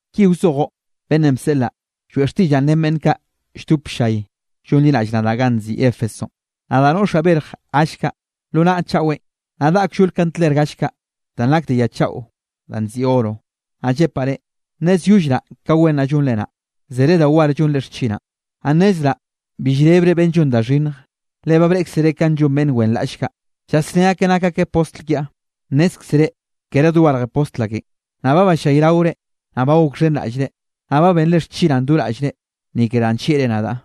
’Ki wzojoꞌ beꞌnnenꞌ bseꞌlaꞌ, lloeꞌ xtiꞌllaꞌ ren beꞌnn kaꞌ lldop ll-llay llonliraꞌll nadaꞌ ganꞌ nziꞌi Éfesonꞌ: “Nadaꞌ noꞌxaꞌ berj gall kaꞌ lo naꞌa chaꞌwenꞌ, naꞌ daꞌa kllol kandler gall kaꞌ danꞌ nak de ya chaꞌo danꞌ nziꞌi oro, naꞌ llepaꞌ reꞌ: Nnezyollraꞌ ka wen naꞌ llonre naꞌ, zere da war llonre xchinaꞌn. Naꞌ nnezraꞌ bi llrebre beꞌnn llon da xhinnj, le ba breꞌkzere kanꞌ llon beꞌnn wenraꞌll kaꞌ, llasné akeꞌ nak akeꞌ postl kiaꞌ, nnézkzere kere dogarje postl akenꞌ. Naꞌ ba ballayraore, naꞌ ba gokxhenraꞌllre, naꞌ ba benre xchinaꞌ do raꞌllre, ni ke danꞌ nllieꞌre nadaꞌ,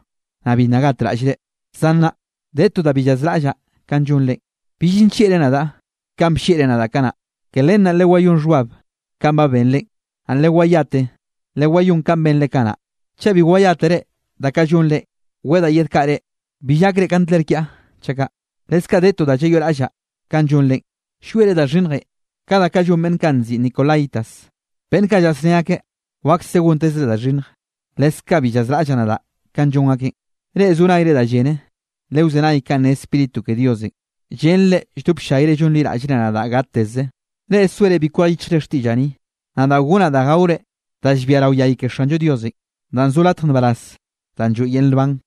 naꞌ bi nna gatraꞌllre. Zan nnaꞌ de to da bi llazraꞌllaꞌ kanꞌ llonrenꞌ: bill nllieꞌre nadaꞌ kanꞌ bllieꞌre nadaꞌ kanaꞌ. Ke len naꞌ lewayón xhbab kanꞌ ba benrenꞌ, naꞌ lewayate lewayón kanꞌ benre kanaꞌ. Chaꞌ bi wayátere da kaꞌ llonrenꞌ, wedaꞌ yedkaꞌa reꞌ, bill gakre kandler kiaꞌ chaꞌ kaꞌ. Leskaꞌ de to da llayoꞌraꞌllaꞌ kanꞌ llonrenꞌ: llwiere da xhinnjenꞌ ka da kaꞌ llon beꞌnn kaꞌ nziꞌi nicolaítas, beꞌnn kaꞌ llasné akeꞌ wakse gontezre da xhinnj, leskaꞌ bi llazraꞌllaꞌ nadaꞌ kanꞌ llon akeꞌn. Reꞌ zo nayre da llene, lewzenay kanꞌ ne Spíritu ke Diosenꞌ, llen reꞌ lldop ll-llayre llonliraꞌllre nadaꞌ gateze: Reꞌ soere bi kwej yichjre xtiꞌllaꞌ ni, nadaꞌ gonnaꞌ da gaore da llbia rao yay ke Xanllo Diosenꞌ, danꞌ zo latj nbaraz danꞌ lloeꞌ yel nban.”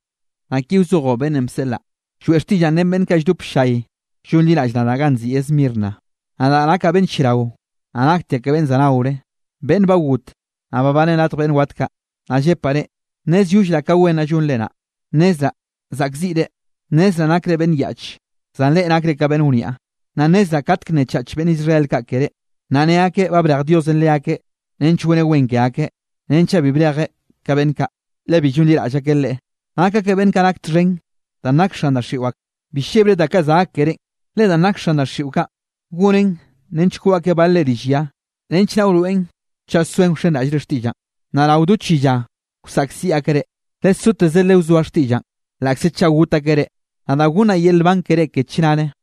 ’Naꞌ ki wzojoꞌ beꞌnnenꞌ bseꞌlaꞌ, lloeꞌ xtiꞌllaꞌn ren beꞌnn kaꞌ lldop ll-llay llonliraꞌll nadaꞌ ganꞌ nziꞌi Esmirna: “Nadaꞌ nakaꞌ beꞌnn lliarao, naꞌ naktiaꞌ ka beꞌnn za naore, beꞌnn ba got, naꞌ babaneꞌ radj beꞌnn wat kaꞌ, naꞌ llepaꞌ re: Nnezyollraꞌ ka wen naꞌ llonre naꞌ. Nnezraꞌ zaꞌkziꞌre. Nnezraꞌ nakre beꞌnn yaꞌche, zan reꞌ nakre ka beꞌnn wniaꞌ. Naꞌ nnezraꞌ katke nnechach beꞌnn Israel kaꞌ keré, naꞌ ne akeꞌ ba brej Diosenꞌ leakeꞌ nench goneꞌ wen ke akeꞌ. Renchaꞌ bi brejeꞌ ka beꞌnn kaꞌ, le bi llonliraꞌll akeꞌ Leꞌe, nak akeꞌ beꞌnn nak txhen danꞌ nak xan daxiꞌo ak. Bi llebre da kaꞌ za gak kerénꞌ, le danꞌ nak xan daxiꞌo kaꞌn, gonen nench koꞌ akeꞌ balre rill ya, nench naꞌ wroeꞌn chaꞌ soen wsanraꞌllre xtiꞌllaꞌn. Naꞌ rao do chi lla wsaꞌkziꞌ akeꞌ reꞌ. Lesoteze lewzoa xtiꞌllaꞌn laꞌkze chaꞌ got akeꞌ reꞌ, nadaꞌ gonnaꞌ yel nban keré ke chnare.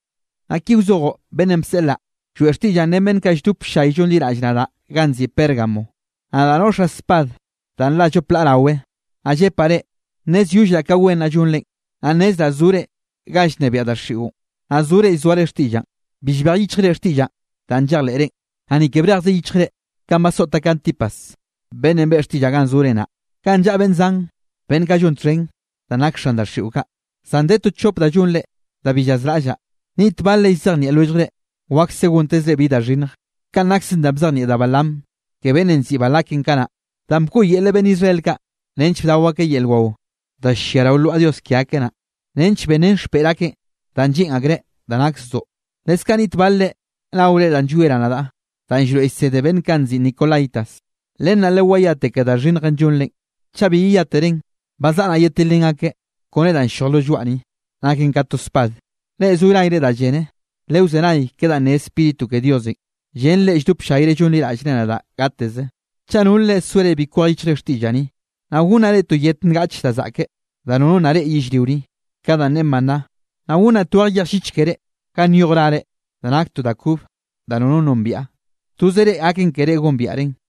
’Naꞌ ki wzojoꞌ beꞌnnenꞌ bseꞌlaꞌ, lloeꞌ xtiꞌllaꞌn ren beꞌnn kaꞌ lldop ll-llay llonliraꞌll nadaꞌ ganꞌ nziꞌi Pérgamo: “Nadaꞌ noꞌxaꞌ spad danꞌ nla llop laꞌ rawe, naꞌ llepaꞌ reꞌ: Nnezyollraꞌ ka wen naꞌ llonrenꞌ. Naꞌ nnezraꞌ zore ganꞌ llnebiaꞌ daxiꞌon, naꞌ zore llzoare xtiꞌllaꞌn. Bi llbej yichjre xtiꞌllaꞌn danꞌ llejleꞌrenꞌ, naꞌ ni ke brej yichjzreꞌ kanꞌ basoꞌte Antipas beꞌnnenꞌ beꞌe xtiꞌllaꞌn ganꞌ zore naꞌ, ganꞌ llaꞌa beꞌnn zan beꞌnn kaꞌ llon txhen danꞌ nak xan daxiꞌo kaꞌ. Zan de to chop da llonre da bi llazraꞌllaꞌ. Niꞌt balre llzejnieꞌ lwelljre wakse gontezre bi da xhinnj. Kanꞌ nakse danꞌ bzejnieꞌ da Balaam ke beꞌnnenꞌ nziꞌi Balakenꞌ kanaꞌ, danꞌ bkoꞌyelreꞌ beꞌnn Israel kaꞌ nench bdao akeꞌ yel wao da llia rao lwaꞌa dios ke akeꞌ naꞌ, nench benrén xpeꞌr akeꞌ da lleꞌn akreꞌ da nak zdoꞌ. Leskaꞌ niꞌt balre naore danꞌ llwieraꞌ nadaꞌ, danꞌ llroeꞌ llsede beꞌnn kaꞌ nziꞌi nicolaítas. Len naꞌ lewayate ke da xhinnjenꞌ llonrenꞌ. Chaꞌ bi yeyáterenꞌ, ba zaꞌa naꞌ yedtilrén akeꞌ kone danꞌ ll-lloj lo lloaꞌ ni, naken ka to spad. Reꞌ zo nayre da llene lewzenay ke danꞌ ne Spíritu ke Diosenꞌ, llen reꞌ lldop ll-llayre llonliraꞌllre nadaꞌ gateze: Chaꞌ nol reꞌ soere bi kwej yichjre xtiꞌllaꞌ ni, naꞌ gonnaꞌ reꞌ to yet ngaꞌche da zaꞌke da nono nna reꞌe yellrio ni, ka danꞌ ne maná, naꞌ gonnaꞌ tweje yej llich keré, ga nyoj rare da nak to da kobe da nono nombiaꞌ, toze reꞌ gaken keré gombiaꞌren.”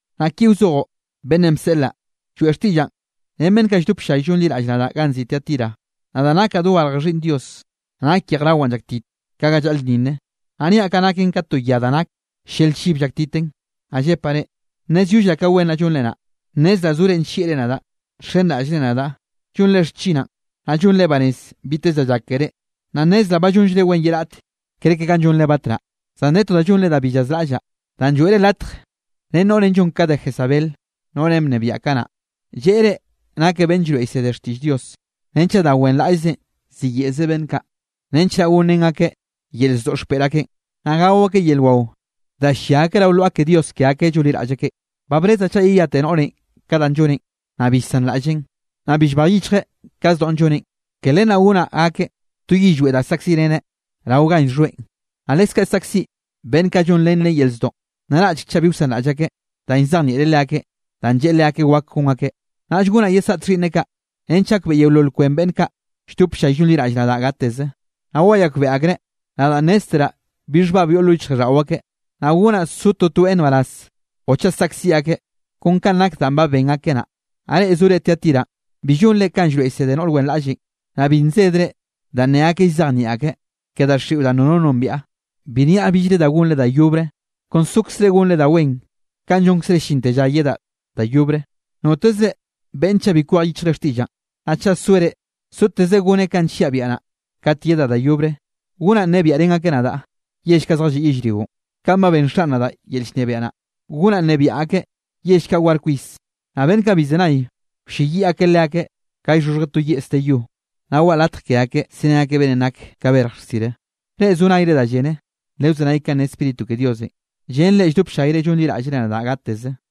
’Naꞌ ki wzojoꞌ beꞌnnenꞌ bseꞌlaꞌ, lloeꞌ xtiꞌllaꞌn ren beꞌnn kaꞌ lldop ll-llay llonliraꞌll nadaꞌ ganꞌ nziꞌi Tiatira: “Nadaꞌ nakaꞌ dogarje Xhiꞌnn Dios, naꞌ nak yejrawaꞌn llaktit ka ga llaꞌlnninne, naꞌ niaꞌ kaꞌ llaken ka to ya da nak llel-llibe llaktiten, naꞌ llepaꞌ reꞌ: Nnezyollraꞌ ka wen naꞌ llonre naꞌ, nnezraꞌ zore nllieꞌre nadaꞌ, nxenraꞌllre nadaꞌ, llonre xchinaꞌn, naꞌ llonre banez biteze da llak keré, naꞌ nnezraꞌ ba llonllre wen ye raꞌt kerke kanꞌ llonre batnaꞌ. Zan de to da llonre da bi llazraꞌllaꞌ: danꞌ lloeꞌre latj ren noꞌrenꞌ llon ka da Jezabel noꞌrenꞌ bnebiaꞌ kanaꞌ. Lleꞌe reꞌ nakeꞌ beꞌnn llroeꞌ llsedreꞌ xtiꞌll Dios, renchaꞌ da wenraꞌllzenꞌ ziyeꞌze beꞌnn kaꞌ, nench naꞌ gonrén akeꞌ yel zdoꞌ xpeꞌr akeꞌn, naꞌ gao akeꞌ yel wao da ll-llia akeꞌ rao lwaꞌa ke dios ke akeꞌ llonliraꞌll akeꞌ. Ba brezaꞌ chaꞌ yeyate noꞌrenꞌ ka danꞌ lloneꞌn, naꞌ bi llsanraꞌlleꞌn, naꞌ bi llbej yichjeꞌ ka zdoꞌn lloneꞌn. Ke len naꞌ gonaꞌ gakeꞌ to yillweꞌ da saꞌkziꞌreneꞌ rao ganꞌ llxhoeꞌn, naꞌ leskaꞌ saꞌkziꞌ beꞌnn kaꞌ llonrén leꞌe yel zdoꞌ, naraꞌchek chaꞌ bi wsanraꞌll akeꞌ danꞌ llzejnieꞌreꞌ leakeꞌn danꞌ lleꞌe leakeꞌ wak gon akeꞌ. Naꞌll gonaꞌ yesaꞌt xhiꞌnneꞌ kaꞌ, nench gakbeꞌe yeolol kwen beꞌnn kaꞌ lldop ll-llay llonliraꞌll nadaꞌ gateze, naꞌ wayakbeꞌe akreꞌ nadaꞌ nnézteraꞌ bi xhbab yoꞌ lo yichjraꞌlldaꞌo akeꞌ, naꞌ gonaꞌ so totoeꞌ nbaraz o chaꞌ saꞌkziꞌ akeꞌ kon kanꞌ nak danꞌ ba ben akeꞌ naꞌ. Naꞌ reꞌ zore Tiatiranꞌ bi llonre kanꞌ llroeꞌ llsede noꞌr wenraꞌllenꞌ, naꞌ bi nsedre danꞌ ne akeꞌ llzejnieꞌ akreꞌ ke daxiꞌon danꞌ nono nombiaꞌ, bi nniaꞌ billre da gonre da yobre. Kon sokzre gonre da wen kanꞌ llonkzre llinte lla yedaꞌ da yobre. Notezre beꞌnne chaꞌ bi kwej yichjeꞌ xtiꞌllaꞌn, naꞌ chaꞌ soereꞌ soteze goneꞌ kanꞌ nlliaꞌ biaꞌa naꞌ, kat yedaꞌ da yobre, gonaꞌ nnebiaꞌrén akeꞌ nadaꞌ yell kaꞌ zjalliꞌ yellrionꞌ. Kanꞌ ba benn Xaꞌn nadaꞌ yel llnebiaꞌ naꞌ, gonaꞌ nnebiaꞌ akeꞌ yell kaꞌ war kwis. Naꞌ beꞌnn kaꞌ bi llzenay, wlleyiꞌ akeꞌ leakeꞌ ka llxhoxhjeꞌ to yeꞌs de yo. Naꞌ waꞌa latj ke akeꞌ serén akeꞌ beꞌnnenꞌ nak ka berj rsire. Reꞌ zo nayre da llene, lewzenay kanꞌ ne Spíritu ke Diosenꞌ, llen reꞌ lldop ll-llayre llonliraꞌllre nadaꞌ gateze.”